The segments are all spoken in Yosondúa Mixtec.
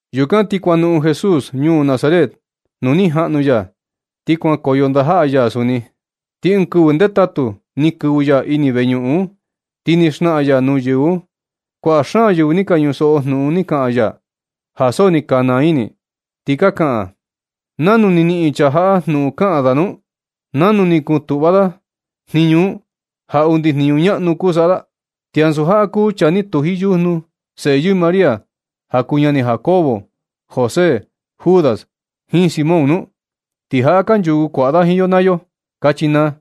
Yukan ti kuanoꞌon Jesús ñuu Nazaret nuu ni jaꞌnu ya, ti kuankoyo ndajaꞌa ya suni. Ti ɨɨn kɨvɨ ndetatu ni kɨvɨ ya ini veñuꞌun un, ti ni xnaꞌan ya nuu yɨvɨ un. Kuaꞌa xaan yɨvɨ ni ka ñusoꞌo jnuꞌun ni kaꞌan ya, ja so ni ka naa ini, ti ka kaꞌan: ―¿Nanu ni niꞌin chaa jaꞌa jnuꞌun kaꞌan da un? ¿Nanu ni kutuꞌva da jniñu un ja undi jniñu ñaꞌnu kuu saꞌa da? ¿Ti ansu jaꞌa kuu chaa ni tuji yujnu, seꞌe yɨɨ María, ja kuu ñani Jacobo, José, Judas, jiin Simón nu? Ti jaꞌa kanchuku kuaꞌa da jiin yo naa yo ―kachi naa.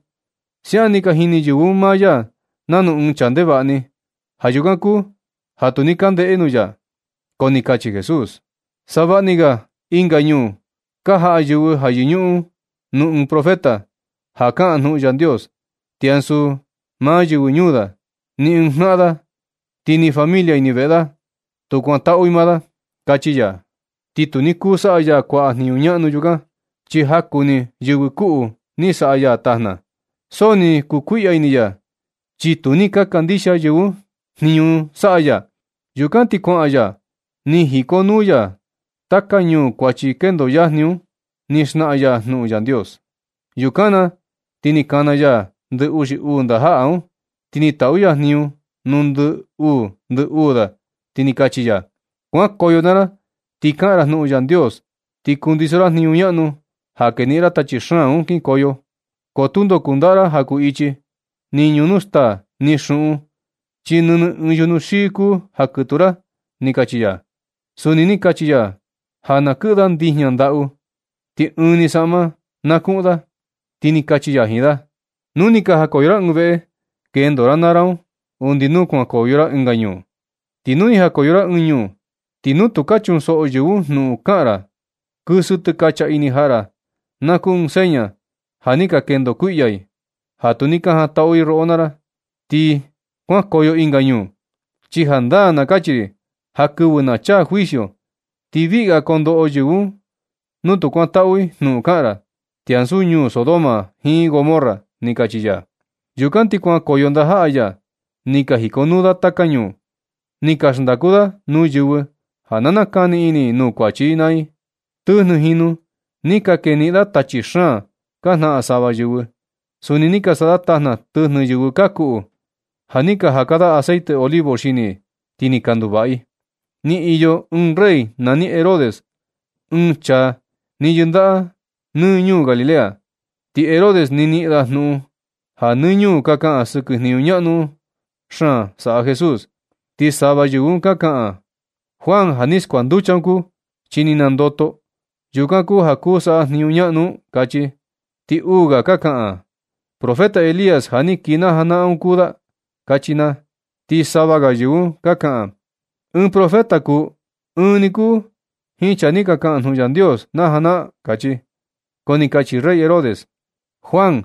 Siaꞌan ni ka jini yɨvɨ un maa ya nanu ɨɨn chaa ndevaꞌa ni. Ja yukan kuu ja tu ni ka ndeꞌe nuu ya. Ko ni kachi Jesús: ―Savaꞌa ni ga ɨnga ñuu ka jaꞌa yɨvɨ ja yɨñuꞌun nuu ɨɨn profeta, ja kaꞌan jnuꞌun Yandios. Ti ansu maa yɨvɨ ñuu da, ni ɨɨn jnaꞌan da, ti ni familia ini veꞌe da, tu kuantaꞌu i maa da ―kachi ya. Ti tu ni kuu saꞌa ya kuaꞌa jniñu ñaꞌnu yukan. Chi jaku ni yɨvɨ kuꞌu ni saꞌa ya tajna. So ni kukuiꞌya ini ya, chi tu ni ka kandixia yɨvɨ un jniñu saꞌa ya. Yukan ti kuaꞌan ya ni jikonuu ya taka ñuu kuachi kendo yajni un, ni xnaꞌan ya jnuꞌun Yandios. Yukan na, ti ni kana ya ndɨ uxi uu ndajaꞌa un. Ti ni taꞌu ya jniñu nuu ndɨ uu ndɨ uu da, ti ni kachi ya: ―Kuankoyo naa ra ti kaꞌan ra jnuꞌun Yandios, ti kundiso ra jniñu ñaꞌnu ja keniꞌin ra tachi xaan un kinkoyo. Ko tundo kundaꞌa ra ja kuu ichi, ni ñunu staa, ni xuꞌun, chi nɨnɨ ɨɨn yujnu xii kuu ja kɨtuu ra ―ni kachi ya. Suni ni kachi ya ja na kɨꞌɨ da ndijña ndaꞌu, ti ɨɨn ni saꞌma na kuꞌun da. Ti ni kachi ya jiin da: ―Nu ni ka jakoyo ra ɨɨn veꞌe, kendo ra naa ra un, undi nu kuankoyo ra ɨnga ñuu. Ti nu ni jakoyo ra ɨɨn ñuu, ti nu tu ka chunsoꞌo yɨvɨ un jnuꞌun ka kaꞌan ra, kɨsɨ tɨkacha ini jaꞌa ra, na kuu ɨɨn seña ja ni ka kendo kuiꞌya i ja tu ni ka jantaꞌu i roꞌo naa ra, ti kuankoyo ɨnga ñuu. Chi jandaa na kachi ri ja kɨvɨ na chaa juicio, ti viꞌga koo ndoꞌo yɨvɨ un nu tu kuantaꞌu i jnuꞌun kaꞌan ra, ti ansu ñuu Sodoma jiin Gomorra ―ni kachi ya. Yukan ti kuankoyo ndajaꞌa ya, ni ka jikonuu da taka ñuu, ni ka xndaku da nuu yɨvɨ ja na nakani ini i nuu kuachi i naa i. Tɨjnɨ jinu ni ka keniꞌin da tachi xaan ka jnaꞌan sava yɨvɨ. Suni ni ka saꞌa da tajna tɨjnɨ yɨvɨ ka kuꞌu, ja ni ka jaka da aceite olivo xini i, ti ni ka nduvaꞌa i. Ni iyo ɨɨn rey nani Herodes, ɨɨn chaa ni yɨndaꞌa nɨ ñuu Galilea. Ti Herodes ni niꞌin da jnuꞌun ja nɨ ñuu ka kaꞌan sɨkɨ jniñu ñaꞌnu xaan saꞌa Jesús. Ti sava yɨvɨ un ka kaꞌan: ―Juan ja ni skuanducha un kuu, chi ni nandoto. Yukan kuu ja kuu saꞌa jniñu ñaꞌnu un ―kachi. Ti uu ga ka kaꞌan: ―Profeta Elías ja ni kii na janaꞌan un kuu da ―kachi naa. Ti sava ga yɨvɨ un ka kaꞌan: ―Ɨɨn profeta kuu, ɨɨn ni kuu jiin chaa ni ka kaꞌan jnuꞌun Yandios na janaꞌan―kachi. Ko ni kachi rey Herodes: ―Juan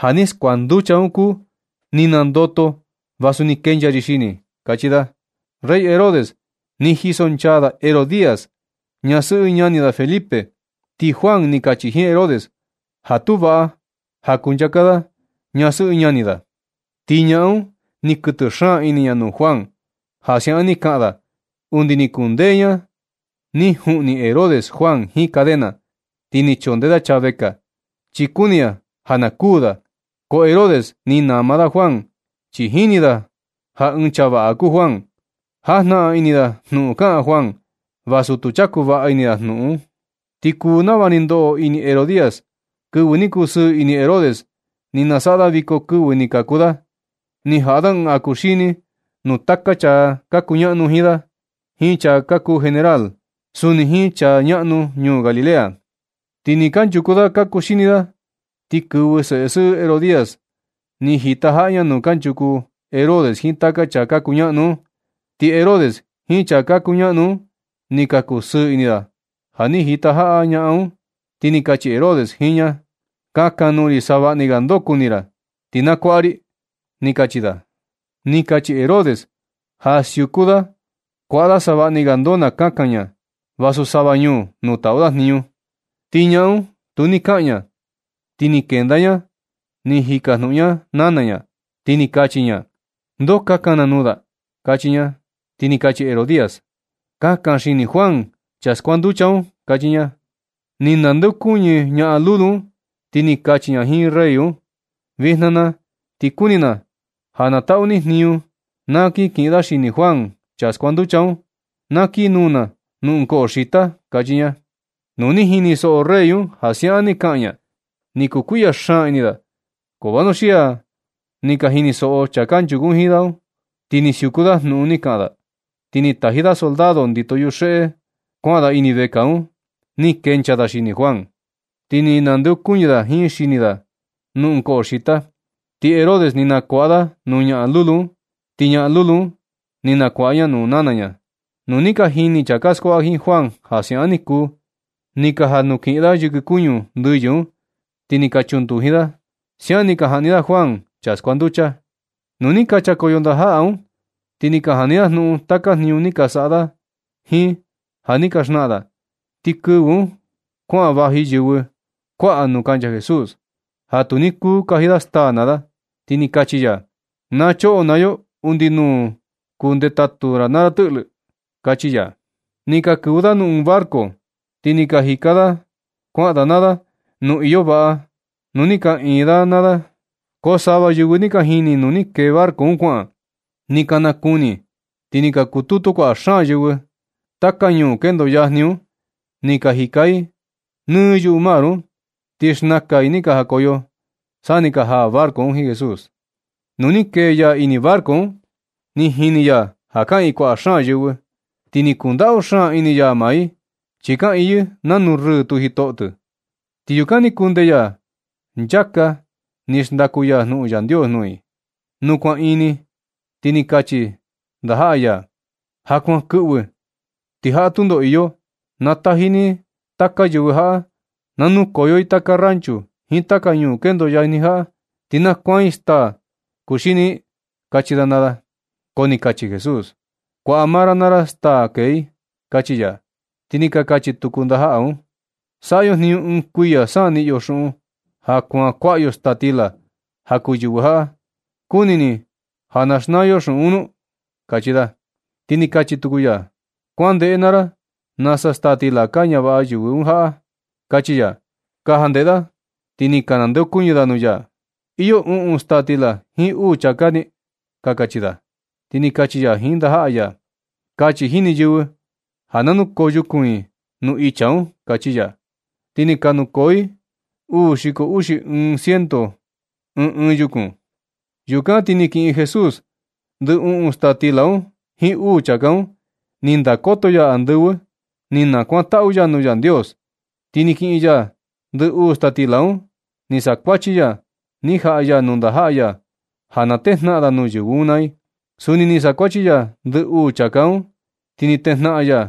ja ni skuanducha un kuu. Ni nandoto vasu ni kenchaa ri xini ―kachi da. Rey Herodes ni jisonchaa da Herodías, ñasɨꞌɨ ñani da Felipe. Ti Juan ni kachi jiin Herodes ja tu vaꞌa ja kuncha da jiin ñasɨꞌɨ ñani da. Ti ñaꞌan un ni kɨtɨ xaan ini ña nuu Juan ja siaꞌan ni kaꞌan da, undi ni kundee ña ni juꞌni Herodes Juan jiin cadena, ti ni chondee da chaa vekaa, chi kuni ña ja na kuū da. Ko Herodes ni nama da Juan, chi jini da ja ɨɨn chaa vaꞌa kuu Juan. Jajnaꞌan ini da jnuꞌun kaꞌan Juan, vasu tu chaku vaꞌa ini da jnuꞌun. Ti kuu nava ni ndoꞌo ini Herodías. Kɨvɨ ni kusɨɨ ini Herodes ni nasaꞌa da viko kɨvɨ ni kaku da. Ni jaꞌa da ɨɨn ja kuxini nuu taka chaa ka kuñaꞌnu jiin da jiin chaa ka kuu generál, suni jiin chaa ñaꞌnu ñuu Galilea. Ti ni kanchuku da ka kuxini da, ni kɨvɨ seꞌe sɨꞌɨ Herodías. Ni jitajaꞌa ña nuu kanchuku Herodes jiin taka chaa ka kuñaꞌnu un. Ti Herodes jiin chaa ka kuñaꞌnu un ni ka kusɨɨ ini da ja ni jitajaꞌa ñaꞌan un. Ti ni kachi Herodes jiin ña: ―Kakan nuu ri savaꞌni ga ndoo kuni ra, ti na kuaꞌa ri ―kachi da. Ni kachi Herodes ja siuku da kuaꞌa da savaꞌni ga ndoo na kakan ña, vasu sava ñuu nuu taꞌu da jniñu. Ti ñaꞌan un tu ni kaꞌan ña, ti ni kenda ña ni jikajnuꞌun ña nana ña, ti ni kachi ña: ―¿Ndoo kakan na nuu da? ―kachi ña. Ti ni kachi Herodías: ―Kakan xini Juan, chaa skuanducha un ―kachi ña. Ni nandeokuñɨ ñaꞌan lulu un, ti ni kachi ña jiin rey un: ―Vijna na ti kuni na ja na taꞌu ni jniñu na kin kiꞌin da xini Juan, chaa skuanducha un. Na kii nuu na nuu ɨɨn koꞌo xita ―kachi ña. Nu ni jinisoꞌo rey un ja siaꞌan ni kaꞌan ña, ni kukuiꞌya xaan ini da. Ko vanuxia ni ka jinisoꞌo chaa kanchuku jiin da un. Ti ni siuku da jnuꞌun ni kaꞌan da. Ti ni taji da soldado ndito yuxeꞌe un kuaꞌan da ini vekaa un. Ni kenchaa da xini Juan. Ti ni nandeokuñɨ da jiin xini da un nuu ɨɨn koꞌo xita. Ti Herodes ni nakuaꞌa da nuu ñaꞌan lulu un, ti ñaꞌan lulu un ni nakuaꞌa ña nuu nana ña. Nu ni ka jini chaa ka skuaꞌa jiin Juan ja siaꞌan ni kuu, ni ka janukiꞌin da yɨkɨ kuñu ndɨyɨ un, ti ni ka chunduji da. Siaꞌan ni ka jaꞌni da Juan, chaa skuanducha. Nu ni ka nchakoyo ndajaꞌa un, ti ni ka jani da jnuꞌun taka jniñu ni ka saꞌa da jiin ja ni ka xnaꞌan da. Ti kɨvɨ un kuaꞌan vaji yɨvɨ kuaꞌa nuu kancha Jesús, ja tu ni kuu kaji da staa naa da. Ti ni kachi ya: ―Na choꞌo naa yo undi nuu kuu ndetatu ra naa ra tɨꞌlɨ ―kachi ya. Ni ka kɨvɨ da nuu ɨɨn barco, ti ni ka jika da kuaꞌa da naa da nuu iyo vaꞌa, nuu ni kaꞌiin maa da naa da. Ko sava yɨvɨ ni ka jini nuu ni kee barco un kuaꞌan, ni ka nakuni. Ti ni ka kututu kuaꞌa xaan yɨvɨ taka ñuu kendo yajni un. Ni ka jika i nɨ yuꞌu mar un, ti xnakan i ni ka jakoyo, sa ni jaa barco un jiin Jesús. Nu ni kee ya ini barco un, ni jini ya ja kaꞌiin kuaꞌa xaan yɨvɨ. Ti ni kundaꞌu xaan ini ya maa i. Chi kaꞌiin yɨ nanu rɨɨ tu jitoꞌo. Ti yukan ni kundee ya nchaka ni xndaku ya jnuꞌun Yandios nuu i. Nu kuan ini, ti ni ka kachi ndajaꞌa ya: ―Ja kuan kɨꞌvɨ ti jaꞌa tundo iyo. Na taji ni taka yɨvɨ jaꞌa na nukoyo i taka ranchu jiin taka ñuu kendo yajni jaꞌa, ti na kuaan i staa kuxini i ―kachi da naa da. Ko ni kachi Jesús: ―Kuaꞌa maa ra naa ra staa na kee i ―kachi ya. Ti ni ka kachi tuku ndajaꞌa un: ―Saꞌa yo jniñu ɨɨn kuiya sa niꞌin yo xuꞌun ja kuaan kuaꞌa yo staa stila ja kuu yɨvɨ jaꞌa. ¿Kuni ni ja xnaa yo xuꞌun nu? ―kachi da. Ti ni kachi tuku ya: ―Kuandeꞌe naa ra nasa staa stila ka ñavaꞌa yɨvɨ jaꞌa―kachi ya. Ka jandeꞌe da, ti ni ka nandeokuñɨ da nuu ya: ―Iyo uꞌun staa stila jiin uu chāká ―ni ka kachi da. Ti ni kachi ya jiin ndajaꞌa ya: ―Kachi jini yɨvɨ ja na nukoo yukun i nuu icha un ―kachi ya. Ti ni ka nukoo i uu xiko uxi xi ɨɨn ciento i ɨɨn ɨɨn yukun. Yukan ti ni kiꞌin Jesús ndɨ uꞌun staa stila un jiin uu chāká un. Ni ndakoto ya andɨvɨ. Ni nakuantaꞌu ya nuu Yandios. Ti ni kiꞌin ya ndɨ uꞌun staa stila un, ni sakuachi ya, ni jaꞌa ya nuu ndajaꞌa ya ja na tejnaꞌan da nuu yɨvɨ un naa i. Suni ni sakuachi ya ndɨ uu chāká un, ti ni tejnaꞌan ya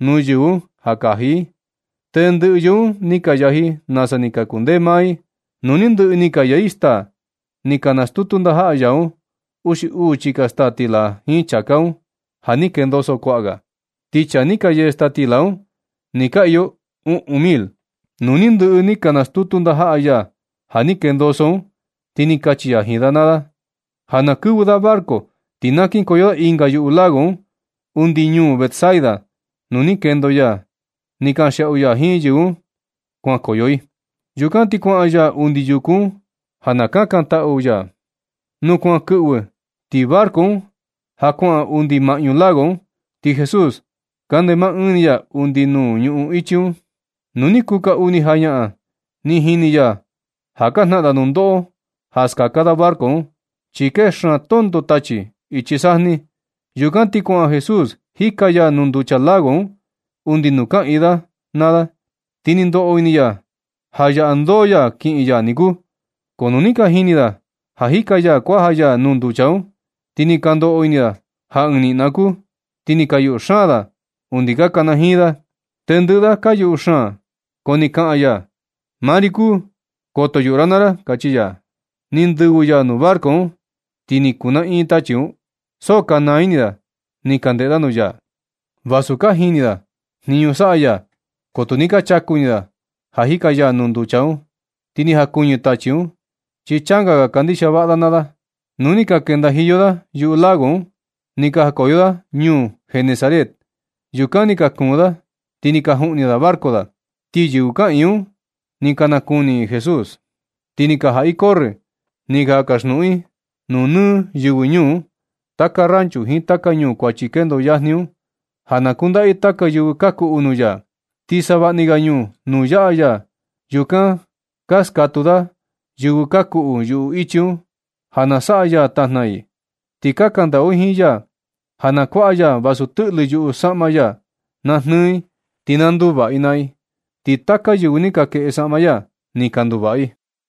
nuu yɨvɨ un ja na kaji i. Tendɨꞌɨ yɨvɨ un ni ka yaji i nasa ni kundee maa i. Nu ni ndɨꞌɨ ni ka yee i staa, ni ka nastutu ndajaꞌa ya un uxi uu chika staa stila jiin chāká un ja ni kendoso kuaꞌa ga. Ti chaa ni ka yee staa stila un ni ka iyo uꞌun mil. Nu ni ndɨꞌɨ ni ka nastutu ndajaꞌa ya ja ni kendoso un, ti ni kachi ya jiin da ja na kɨvɨ da barco, ti na kinkoyo da ɨnga yuꞌu lago un undi ñuu Betsaida, nuu ni kendo ya ni kanxiaꞌu ya jiin yɨvɨ un kuankoyo i. Yukan ti kuaꞌan ya undi yuku un ja na kakantaꞌu ya. Nu kuan kɨꞌvɨ, ti barco un ja kuaꞌan undi maꞌñu lago un. Ti Jesús kande maa ɨɨn ya undi nuu ñuꞌun ichi. Nu ni kuu kaa uni jañaꞌan, ni jini ya ja ka jnaꞌan da nundoꞌo ja skaka da barco un, chi kee xaan tonto tachi ichi sajni. Yukan ti kuaꞌan Jesús jika ya nuu nducha lago un undi nuu kaꞌiin da naa da. Ti ni ndoꞌo ini ya ja yaꞌa ndoo ya kiꞌin ya niku. Ko nu ni ka jini da ja jika ya kuaja ya nuu nducha un, ni ka ndoꞌo ini da ja ɨɨn niꞌna kuu, ti ni ka yuꞌu xaan da undi ka kanajiin da. Tendɨꞌɨ da ka yuꞌu xaan, ko ni kaꞌan ya: ―Maa ri kuu, koto yuꞌu ra naa ra ―kachi ya. Ni ndɨvɨ ya nuu barco un, ti ni kuu naꞌin tachi un. So ka naa ini da ni ka ndeꞌe da nuu ya. Vasu ka jini da jniñu saꞌa ya, ko tu ni ka chaku ini da ja jika ya nuu nducha un, ti ni jakuñɨ tachi un, chi changa ga kandixia vaꞌa da naa da. Nu ni ka kendajiyo da yuꞌu lago un, ni ka jakoyo da ñuu Genesaret. Yukan ni ka kuun da, ti ni ka juꞌni da barco da. Ti yɨvɨ kaꞌiin un ni ka nakuni i Jesús. Ti ni ka jaꞌa i corrɨ, ni ka kaxnuꞌuni nuu nɨ yɨvɨ ñuu, taka ranchu jiin taka ñuu kuachi kendo yajni un, ja na kundaꞌa i taka yɨvɨ ka kuꞌu nuu ya. Ti savaꞌni ga ñuu nuu yaꞌa ya, yukan ka skatuu da yɨvɨ ka kuꞌu yuꞌu ichi un, ja na saꞌa ya tajna i. Ti ka kandaꞌu i jiin ya, ja na kuaꞌa ya vasu tɨꞌlɨ yuꞌu saꞌma ya na jnɨɨ i, ti na nduvaꞌa i naa i. Ti taka yɨvɨ ni ka kueꞌe saꞌma ya, ni ka nduvaꞌa i.